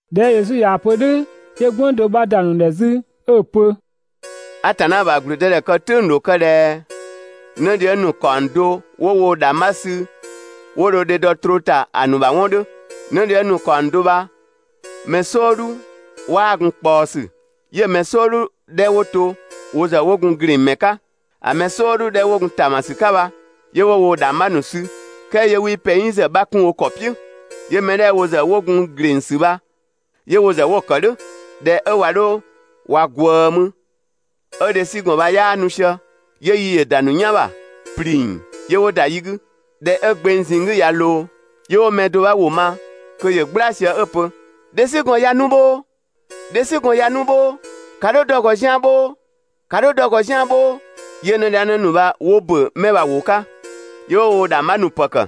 ꞊Dhɛ 'ö Yesu ꞊yaa‑ pö "dhʋ̈ 'yö "gwënng do 'bha ‑da ‑nu ‑dhɛ 'zü 'ö‑ pö: «Atanna ‑bha ‑gblüdëdhɛ kë "tʋ̈ng‑ ‑dho kë ꞊dhɛ 'nëdhiëng ‑nu ‑kaɔng do 'wo woo‑ ‑dhangbha ‑nu sü 'wo dho dhedɔ troo ‑ta ‑a ‑nu ‑bha 'wɔn 'dhö. 'Nëdhiëng ‑nu ‑kaɔng do bha‑ mɛ "sɔɔdhu 'waa gun ꞊kpaɔsü, 'yö‑ mɛ "sɔɔdhu 'dhɛ 'wo to wo ‑zë 'wo gun ‑glengmɛ 'ka. ‑A mɛ "sɔɔdhu 'dhɛ 'wo gun ‑taamasü 'ka bha, 'yö 'wo woo‑ ‑dhangbha ‑nu sü "kɛɛ 'yö 'wii pɛng "yi ‑zë 'bha kun wo ‑kɔ "piʋ̈. 'Yö‑ mɛ 'dhɛ wo ‑zë 'wo gun ‑glengsü bha, 'yö wo ‑zë 'wo‑ ‑kë "dhʋ̈. ꞊Dhɛ 'ö ꞊wa 'dho ꞊wa ꞊gwëë mü 'ö dhesügɔn bha 'yaa nu sië, 'yö yi ‑yö ‑da ‑nu "yan ‑bha, ‑pling 'yö 'wo ‑da yi 'gü. ꞊Dhɛ 'ö gbeng ꞊zinng 'gü ꞊ya ꞊loo, 'yö 'wo mɛ do 'bha ‑wʋ ma kö ‑yö "gbla sië 'ö‑ pö: «Dhesügɔn ꞊ya nu bhoo! Dhesügɔn ꞊ya nu bhoo! ‑Ka 'dho dɔ‑ ‑gɔ zian‑ bhoo! ‑Ka 'dho dɔ‑ ‑gɔ zian‑ bhoo!» 'Yö 'nëdhiëngnë ‑nu bha 'wo ‑bö 'mɛ bha‑ ‑wʋ 'ka, 'yö 'wo woo‑ ‑dhangbha ‑nu ‑pë ‑kë,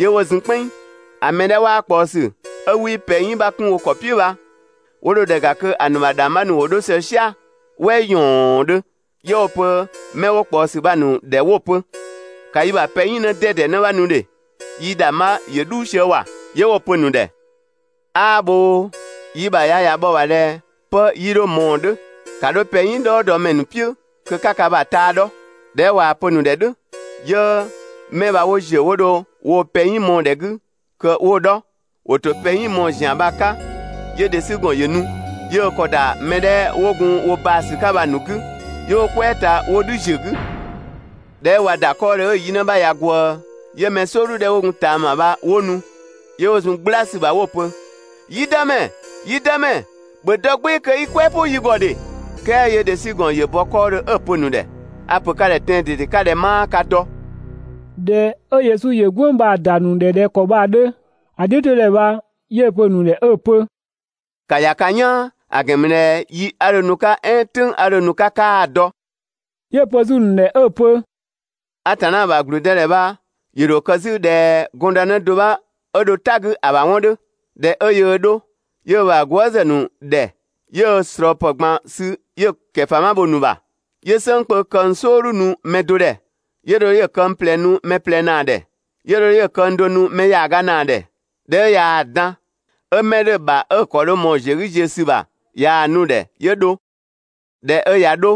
'yö 'wo zun "kpɛnng. ‑A mɛ 'dhɛ 'waa ꞊kpaɔsü 'ö 'wii pɛng "yi 'bha 'kun wo ‑kɔ "piʋ̈ bha 'wo dho ‑dhɛ ‑ga kö ‑a ‑nu ‑bha ‑dhangbha ‑nu ‑wo 'dho sië "sia‑ "wɛ ‑yɔɔndhö 'yö 'wo‑ pö 'mɛ 'dhɛ 'wo ꞊kpaɔsü bha‑ ‑nu ‑dhɛ 'wo‑ pö: «‑Ka yi ‑bha pɛng "yi 'në 'dɛdɛ 'në 'bha nu ‑dhe, yii‑ ‑dhangbha ‑yö "dhuu sië ‑wa!» 'Yö 'wo‑ pö‑ ‑nu ‑dhɛ: «'Aa bhoo! Yi ‑bha ya ꞊ya bhɔ‑ ‑bha ꞊dhɛ 'pë 'yii 'dho ꞊mɔɔ‑ 'dhö, ‑ka 'dho pɛng "yi "dhɔɔdɔmɛ ‑nu "piʋ̈ kö 'ka ka ‑bha taa 'dhɔ!» ꞊Dhɛ 'ö ꞊waa‑ pö‑ ‑nu ‑dhɛ "dhʋ̈, 'yö 'mɛ bha 'wo ‑ziö 'wo dho woo‑ pɛng "yi mɔɔ‑ ‑dhɛ 'gü kö 'wo‑ 'dhɔ. ‑Wo ‑tɔ pɛng "yi mɔɔ‑ ‑zian 'ka 'yö dhesügɔn ‑yö nu, 'yö ö ‑kɔ ‑da mɛ 'dhɛ 'wo gun wo baa‑ ‑sü 'ka bha‑ ‑nu 'gü 'yö 'wo ‑da 'kɔɔdhö, 'yö 'wo "kwɛɛ ta 'wo "dhü ‑ziö 'gü. ꞊Dhɛ 'ö ꞊wa ‑da 'kɔɔdhö 'ö‑ yi 'në 'bha ꞊ya ꞊gwëë, 'yö‑ mɛ "sɔɔdhu 'dhɛ 'wo gun ꞊taama bha 'wo nu, 'yö 'wo zun "gbla ‑sü ‑bha 'wo‑ pö: «Yi dëmɛ, yi dëmɛ, ‑bhö dɔ "gbɩɩ‑ kö i "kwɛɛ "pʋ yi ‑gɔ ‑dhe!» "Kɛɛ 'yö dhesügɔn ‑yö bɔ 'kɔɔdhö 'ö‑ pö‑ ‑nu ‑dhɛ: «A‑ ‑pö ka ‑dhɛ tɛan‑ ꞊dede 'ka ꞊dhɛ 'maa ka dɔ!» ꞊Dhɛ 'ö Yesu ‑yö "gwënng bha‑ ‑da ‑nu ‑dhɛ ꞊dhɛ ‑kɔ bha‑ 'dhö, ‑a "dhiʋ̈todhɛ bha 'yö‑ pö‑ ‑nu ‑dhɛ 'ö‑ pö: «‑Ka ‑ya ka "yaan! ‑A ‑gɛn ‑mü ꞊dhɛ yi 'a dho nu‑ 'ka "ɛɛn "tʋ̈ng 'a dho nu‑ 'ka 'kaa‑ dɔ!» 'Yö‑ pö 'zü‑ ‑nu ‑dhɛ 'ö‑ pö: «Atanna ‑bha ‑gblüdëdhɛ bha ‑yö ‑dho kë 'zü ꞊dhɛ gɔndënë do 'bha 'ö dho "ta 'gü ‑a ‑bha 'wɔn 'dhö. ꞊Dhɛ 'ö yöö 'dho 'yö ö ‑bha gwëëzë ‑nu ‑dhɛ 'yö ö ꞊slɔɔpë ꞊gban sü 'yö‑ ‑kɛfama bho‑ ‑nu ‑bha. 'Yö "sënng kpö këng "sɔɔdhu nu mɛ do ‑dhɛ, 'yö dho 'yö‑ këng ꞊plɛ nu mɛ ꞊plɛ ‑naa ‑dhɛ, 'yö dho 'yö‑ këng do nu mɛ ‑yaaga ‑naa ‑dhɛ. ꞊Dhɛ 'ö ꞊yaa‑ dan, 'ö 'mɛ 'dhö‑ ‑bha 'ö‑ ‑kɔ dho ꞊mɔɔ‑ ‑ziö 'gü ziö ‑sü ‑bha ꞊yaa‑ nu‑ ‑dhɛ 'yö dho. ꞊Dhɛ 'ö ꞊ya 'dho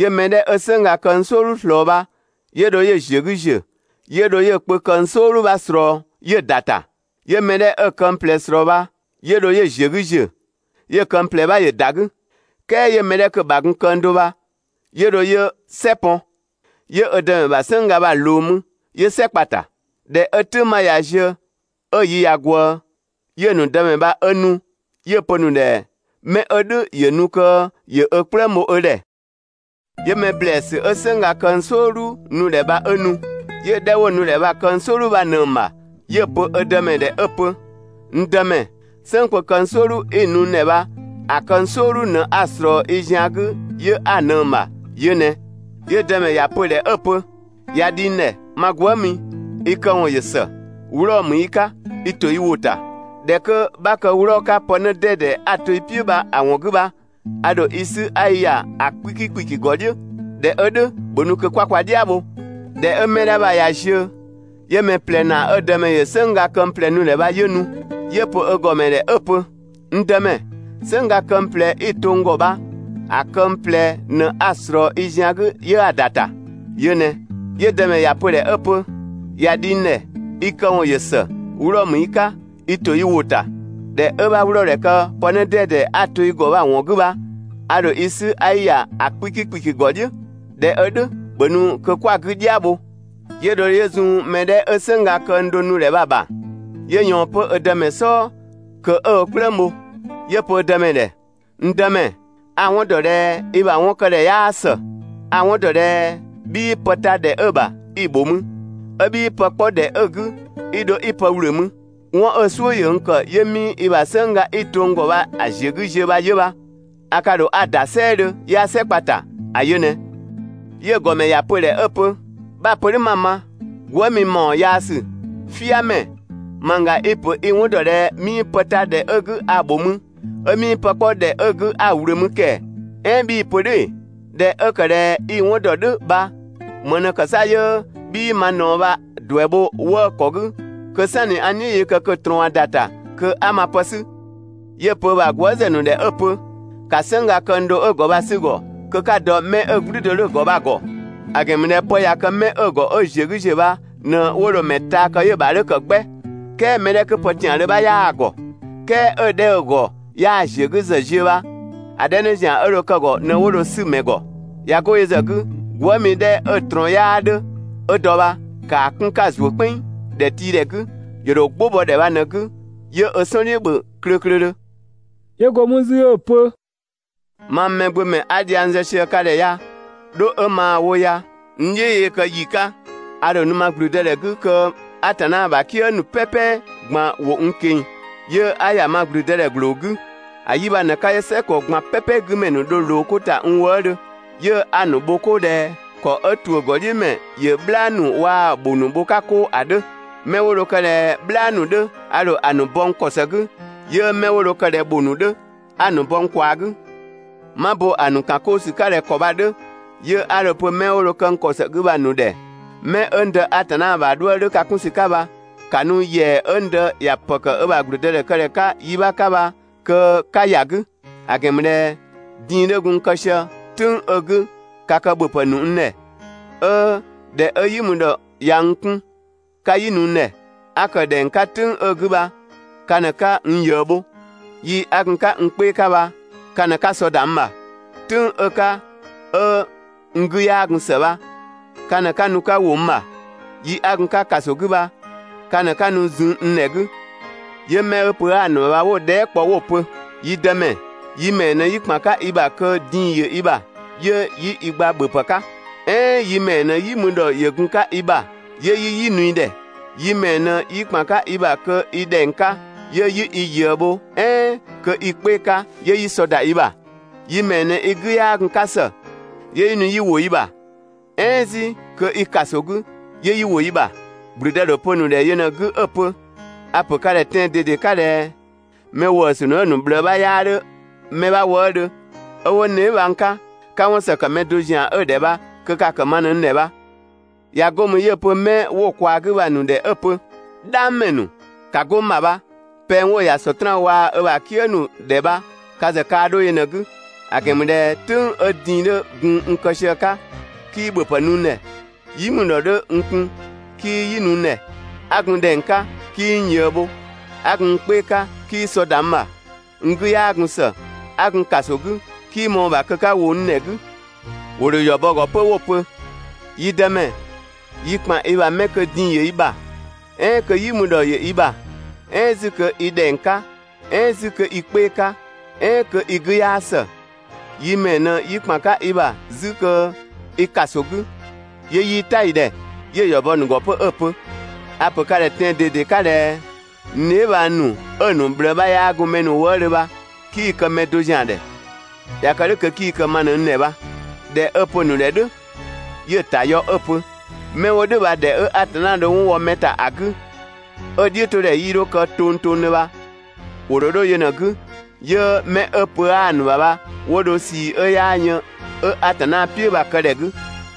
'yö mɛ 'dhɛ 'ö "sënngga këng "sɔɔdhu ꞊slɔɔ bha, 'yö dho 'yö‑ ‑ziö 'gü ‑ziö 'yö dho 'yö‑ kpö këng "sɔɔdhu 'bha ꞊slɔɔ 'yö‑ ‑da ‑ta. 'Yö mɛ 'dhɛ 'ö‑ këng ꞊plɛ ꞊slɔɔ 'pö bha, 'yö dho 'yö‑ ‑ziö 'gü ‑ziö, 'yö‑ këng ꞊plɛ 'bha ‑yö ‑da 'gü. "Kɛɛ 'yö 'mɛ 'kö‑ ‑bha gun këng do bha 'yö dho 'yö "sɛ pɔn, 'yö ö dëmɛ bha "sënngga bha‑ ꞊loo mü, 'yö "sɛ kpa‑ ‑ta. ꞊Dhɛ 'ö "tʋ̈ng 'bha ꞊ya ziö 'ö‑ yi ꞊ya ꞊gwëë, 'yö‑ ‑nu dëmɛ bha 'ö nu 'yö‑ pö‑ ‑nu ‑dhɛ mɛ 'ö "dhʋ̈ ‑yö nu kö ‑yö ö "kplëng bho ö ‑dhɛ. 'Yö‑ mɛ ‑blɛɛsü 'ö "sënngga këng "sɔɔdhu nu‑ ‑dhɛ bha 'ö nu. 'Yö‑ 'dhɛ 'wo‑ nu‑ ‑dhɛ bha‑ këng "sɔɔdhu 'bha ꞊nëng‑ ‑bha 'yö‑ pö ö dëmɛ ‑dhɛ 'ö‑ pö: «N dëmɛ, "sënng kpö këng "sɔɔdhu 'i‑ nu n ‑dhɛ bha‑ këng "sɔɔdhu ꞊në 'a ꞊slɔɔ i zian 'gü 'yö 'a‑ ꞊nëng‑ ‑bha, yö ꞊nɛ!» 'Yö‑ dëmɛ ‑ya pö‑ ‑dhɛ 'ö‑ pö: «꞊Ya dhi n ‑dhɛ, ma gwëëmi, i këwɔn ‑yö ‑së. 'Wlɔɔ‑ ‑mü i 'ka, i ‑to i ‑wʋ ‑ta. ꞊Dhɛ 'kö 'bha kë 'wlɔɔ‑ 'ka pë 'në 'dɛdɛ 'a‑ to i "piʋ̈ bha‑ ‑wɔn 'gü bha, ‑a ‑dho i 'sü 'a i ‑ya ‑a 'kpiki ‑kpiki ‑gɔ "dhiʋ̈. ꞊Dhɛ 'ö "dhʋ̈, ‑bhö nu kö 'kwa kwa "dhia bho. ꞊Dhɛ 'ö 'mɛ 'dhɛ bha ꞊ya ziö 'yö‑ mɛ ꞊plɛ ‑naa 'ö‑ dëmɛ ‑yö "sënngga këng ꞊plɛ nu‑ ‑dhɛ bha 'yö nu. 'Yö‑ pö ö ‑gɔmɛ ‑dhɛ 'ö‑ pö: «N dëmɛ, "sënngga këng ꞊plɛ 'i‑ to n ‑gɔ bha‑ këng ꞊plɛ ꞊në 'a‑ ꞊slɔɔ i zian 'gü 'yö ‑da ‑ta, yö ꞊nɛ!» 'Yö‑ dëmɛ ‑ya pö‑ ‑dhɛ 'ö‑ pö: «꞊Ya dhi n ‑dhɛ, i këwɔn ‑yö ‑së, 'wlɔɔ‑ ‑mü i 'ka, i ‑to i ‑wʋ ‑ta. ꞊Dhɛ 'ö 'bha 'wlɔɔ‑ ‑dhɛ kë pë 'në 'dɛdɛ 'a‑ to i ‑gɔ bha‑ ‑wɔn 'gü bha, a ‑dho i 'sü 'a i ‑ya ‑a 'kpiki ‑kpiki ‑gɔ "dhiʋ̈. ꞊Dhɛ 'ö "dhʋ̈, ‑bhö nu kö 'kwa‑ 'gü "dhia bho. 'Yö dho 'yö zun 'mɛ 'dhɛ 'ö "sënngga këng do nu‑ ‑dhɛ bha‑ ‑bha. 'Yö ꞊yɔɔn 'pö ö dëmɛ "sɔɔ kö 'ö ö "kplëng bho. 'Yö‑ pö ö dëmɛ ‑dhɛ: «N dëmɛ, a‑ 'wɔn ‑dɔ ꞊dhɛ i ‑bha 'wɔn kë ‑dhɛ 'yaa ‑së. A‑ 'wɔn ‑dɔ ꞊dhɛ 'bhii pë ta ‑dhɛ 'ö‑ bha i‑ ‑bho mü, 'ö 'bhii pë 'kpɔ ꞊dhɛ 'ö 'gü 'i dho 'i pë ‑wlö mü. 'Wɔn 'ö‑ "suʋ̈ ‑yö n ‑kë 'yö 'mii i ‑bha "sënngga 'i‑ to n ‑gɔ bha‑ ‑ziö 'gü ziö bha 'yö bha. A ka ‑dho 'a‑ ‑da "sɛɛdhö 'yö 'a "sɛ kpa‑ ‑ta, ‑a yö ꞊nɛ.» 'Yö‑ ‑gɔmɛ ‑ya pö‑ ‑dhɛ 'ö‑ pö: «'Bha‑ pö "dhʋ̈ 'ma‑ ma. Gwëëmi ‑mawɔn yaasü, "fiamɛ, mangga i‑ ‑pö i‑ 'wɔn ‑dɔ ꞊dhɛ 'mii pë ta ‑dhɛ 'ö‑ 'gü ‑a ‑bho mü, 'ö 'mii pë 'kpɔ ‑dhɛ 'ö‑ 'gü, 'a‑ ‑wlö mü ‑kɛɛ? "Ɛɛn 'bhii‑ pö "dhʋ̈ ‑ee? ꞊Dhɛ 'ö ‑kë ꞊dhɛ i‑ 'wɔn ‑dɔ "dhʋ̈ bha, ‑më ꞊në ‑kë 'sa 'yö 'bhii ma ꞊naɔ bha‑ ‑duɛ bho 'wëë‑ ‑kɔ 'gü kö "sanni 'a n "dhiʋ̈ yee kë kö ‑a ꞊trɔɔn ꞊ya ‑da ‑ta kö 'a ma pë 'sü.» 'Yö‑ pö ö ‑bha gwëëzë ‑nu ‑dhɛ 'ö‑ pö: «‑Ka "sënngga këng do 'ö‑ ‑gɔ bha‑ 'sü‑ ‑gɔ kö 'ka‑ dɔ mɛ 'ö‑ "gblü do 'dhö‑ ‑gɔ bha‑ ‑gɔ. ‑A ‑gɛn ‑mü ꞊dhɛ pë ꞊ya kë 'mɛ 'ö‑ ‑gɔ 'ö‑ ‑ziö 'gü ‑ziö bha ꞊në 'wo dho‑ mɛ taa kë 'yö‑ ‑bha 'dhö ‑kë 'gbɛ, "kɛɛ mɛ 'dhɛ 'kö pë ‑tiandhö 'bha 'yaa‑ ‑gɔ, "kɛɛ 'ö‑ 'dhɛ 'ö‑ ‑gɔ 'yaa‑ ‑ziö 'gü ‑zë ziö bha, ‑a 'dhɛ 'në ‑zian 'ö dho kë‑ ‑gɔ ꞊në 'wo dho‑ 'sü‑ ‑mɛ ‑gɔ. ꞊Ya 'go yö ‑zë 'gü gwëëmi 'dhɛ 'ö‑ ꞊trɔɔn 'yaa 'dhö 'ö dɔ bha, ‑kaa 'kun 'ka‑ ‑zuö "kpɛnng ‑dhɛtiidhɛ 'gü, ‑yö ‑dho "gbʋ bɔ ‑dhɛ bha ꞊në‑ 'gü, 'yö ö "sɔn "dhiʋ̈ ‑bhö klöklödhö.» 'Yö go mü 'zü 'ö‑ pö: «Mang Mɛgbömɛ 'a dhiang zë sië ka ‑dhɛ ya, dho 'ö maa‑ wo ya, n "dhiʋ̈ yee kë ‑yi 'ka, a ‑dho nu ma ‑gblüdëdhɛ 'gü kö Atanna ‑bha "kië ‑nu "pɛpɛ ꞊gban ‑wo n ꞊keng‑, 'yö 'a ‑ya ma ‑gblüdëdhɛ ‑gbloo 'gü. ‑A 'yi bha ꞊në‑ 'ka 'yö "sɛgɔ ꞊gban "pɛpɛ 'gü ‑mɛ ‑nu dho ꞊loo 'ko ‑ta n wëëdhö, 'yö 'a‑ ‑nu bho 'koo ꞊dhɛ ‑kɔ 'ö ‑tuʋ̈ ‑gɔdhiʋ̈mɛ ‑yö "bhlaa ‑nu waa‑ ‑bhʋ ‑nu bho‑ 'ka 'koo ‑a 'dhö. 'Mɛ 'wo dho kë ꞊dhɛ "bhlaa ‑nu 'dhö, a ‑dho ‑a ‑nu bɔ n ‑kɔ ‑së 'gü, 'yö 'mɛ 'wo dho kë ꞊dhɛ ‑bhʋ ‑nu 'dhö, 'a‑ ‑nu bɔ n ꞊kwaa‑ 'gü. 'Ma bo ‑a ‑nu ‑kan 'koo ‑sü 'ka ꞊dhɛ ‑kɔ bha‑ 'dhö, 'yö 'a‑ pö 'mɛ 'wo dho kë n ‑kɔ ‑së 'gü bha‑ ‑nu ‑dhɛ 'mɛ 'ö n Dë Atanna bha 'dhuë‑ 'dhö ka 'kun ‑sü 'ka bha, ‑ka nu ‑yɛa 'ö n Dë ‑ya ‑pë ‑kë ö ‑bha ‑gblüdëdhɛkëdhɛ 'ka yi 'bha 'ka bha kö 'ka ‑ya 'gü. ‑A ‑gɛn ‑mü ꞊dhɛ din‑ 'dhö gun n kë sië "tʋ̈ng 'ö‑ 'gü ka kë ‑bhöpë ‑nu n ‑dhɛ, 'ö ꞊dhɛ 'ö "yi mü ‑dhɔ ‑ya n 'kun 'ka "yi nu n ‑dhɛ. 'A ‑kë ‑dhɛng 'ka "tʋ̈ng 'ö‑ 'gü bha ka ꞊në 'ka n ꞊yëë bho. Yi 'a gun‑ 'ka n 'kpee‑ ‑ka bha ka ꞊në 'ka sɔ ‑da n ‑bha. "Tʋ̈ng 'ö‑ 'ka 'ö n 'gü 'yaa gun ‑së bha, ka ꞊në 'ka nu 'ka ‑wo n ‑bha. Yi 'a gun‑ 'ka ‑kaso 'gü bha ka ꞊në 'ka nu zun n ‑dhɛ 'gü.» 'Yö mɛ 'ö pö 'aa‑ ‑nu ‑bha bha 'wo‑ dhɛɛ" kpɔ 'wo‑ pö: «Yi dëmɛ, yi ‑mɛɛ ꞊në 'yi ‑kpan 'ka i ‑bha kö din‑ ‑yö i ‑bha, 'yö 'yi i gba ‑bhöpë 'ka? "Ɛɛn yi ‑mɛɛ ꞊në "yi mü ‑dhɔ ‑yö gun‑ 'ka i ‑bha 'yö yi "yi nu i ‑dhɛ? Yi ‑mɛɛ ꞊në 'yi ‑kpan 'ka i ‑bha kö i ‑dhɛng 'ka, 'yö 'yi i ꞊yëë bho "ɛɛn kö i 'kpee‑ 'ka 'yö 'yi sɔ ‑da i ‑bha? Yi ‑mɛɛ ꞊në i 'gü 'yaa gun‑ 'ka ‑së, 'yö 'yi nu 'yi ‑wo i ‑bha, "ɛɛn 'zü kö i ‑kaso 'gü, 'yö 'yi ‑wo i ‑bha?» ‑Gblüdë ‑dho pö‑ ‑nu ‑dhɛ yö ꞊në‑ 'gü 'ö‑ pö: «A‑ ‑pö ka ‑dhɛ tɛan‑ ꞊dede 'ka ꞊dhɛ mɛ ‑wëësü ‑nu 'ö‑ ‑nu ꞊bhlëë 'bha 'yaa 'dhö mɛ 'bha wëëdhö, 'ö 'wo n dheebhang 'ka, 'ka 'wɔn ‑së ‑kë mɛ do ‑zian 'ö‑ ‑dhɛ bha kö ka‑ ‑kë ma ꞊në n ‑dhɛ bha.» ꞊Ya 'go mü 'yö‑ pö 'mɛ 'wo‑ ꞊kwaa‑ 'gü bha‑ ‑nu ‑dhɛ 'ö‑ pö: «"Dhang ‑mɛ ‑nu! ‑Ka 'go n ‑bha bha! Pɛng 'wo‑ ‑ya Sɔtraan waa‑ ö ‑bha "kië ‑nu ‑dhɛ bha ka ‑zë kaa 'dho yö ꞊në‑ 'gü. ‑A ‑gɛn ‑mü ꞊dhɛ "tʋ̈ng 'ö din‑ 'dhö gun n kë sië‑ 'ka, 'kii ‑bhöpë nu n ‑dhɛ, "yi mü ‑dhɔ 'dhö n kun 'kii "yi nu n ‑dhɛ, 'a gun ‑dhɛng 'ka 'kii n ꞊yëë bho, 'a gun n 'kpee‑ 'ka 'kii sɔ ‑da n ‑bha, n 'gü 'yaa gun ‑së, a ‑gun ‑kaso 'gü 'kii ꞊mɔɔ‑ ‑bha kö 'ka ‑wo n ‑dhɛ 'gü.» ‑Wo ‑dho ‑yɔ bɔ‑ ‑gɔ 'pö 'wo‑ pö: «Yi Dëmɛ, yi ‑kpan i ‑bha 'mɛ kö din‑ ‑yö i ‑bha, "ɛɛn kö "yi mü ‑dhɔ ‑yö i ‑bha "ɛɛn 'zü kö i ‑dhɛng 'ka "ɛɛn 'zü kö i i 'kpee‑ 'ka "ɛɛn kö i 'gü 'yaa ‑së, yi ‑mɛɛ ꞊në 'yi ‑kpan 'ka i ‑bha 'zü kö i ‑kaso 'gü, 'yö 'yii "ta i ‑dhɛ?» 'Yö‑ ‑yɔ bɔ 'pö‑ ‑nu ‑gɔ 'ö‑ pö: «A‑ ‑pö ka ‑dhɛ tɛan‑ ꞊dede 'ka ꞊dhɛ: N dheebhang ‑nu 'ö‑ ‑nu ꞊bhlëë 'bha 'yaa gun mɛ ‑nu wëëdhö bha, 'kii‑ kë‑ mɛ do ‑zian ‑dhɛ. ꞊Ya kë "dhʋ̈ kö 'kii‑ kë ma ꞊në n ‑dhɛ bha.» ꞊Dhɛ 'ö‑ pö‑ ‑nu ‑dhɛ "dhʋ̈ 'yö‑ ‑ta yɔ 'ö‑ pö: «'Mɛ 'wo "dhʋ̈ bha ‑dhɛ 'ö Atanna dho 'wɔn wɔ mɛ ‑ta ‑a 'gü, 'ö‑ "dhiʋ̈ 'to ‑dhɛ 'yii 'dho kë tongtongdhö bha ‑wo ‑dho 'dho yö ꞊në‑ 'gü, 'yö 'mɛ 'ö pö 'aa‑ ‑nu ‑bha bha 'wo dho ꞊sii 'ö 'yaa yën 'ö Atanna "piʋ̈ bha‑ kë ‑dhɛ 'gü.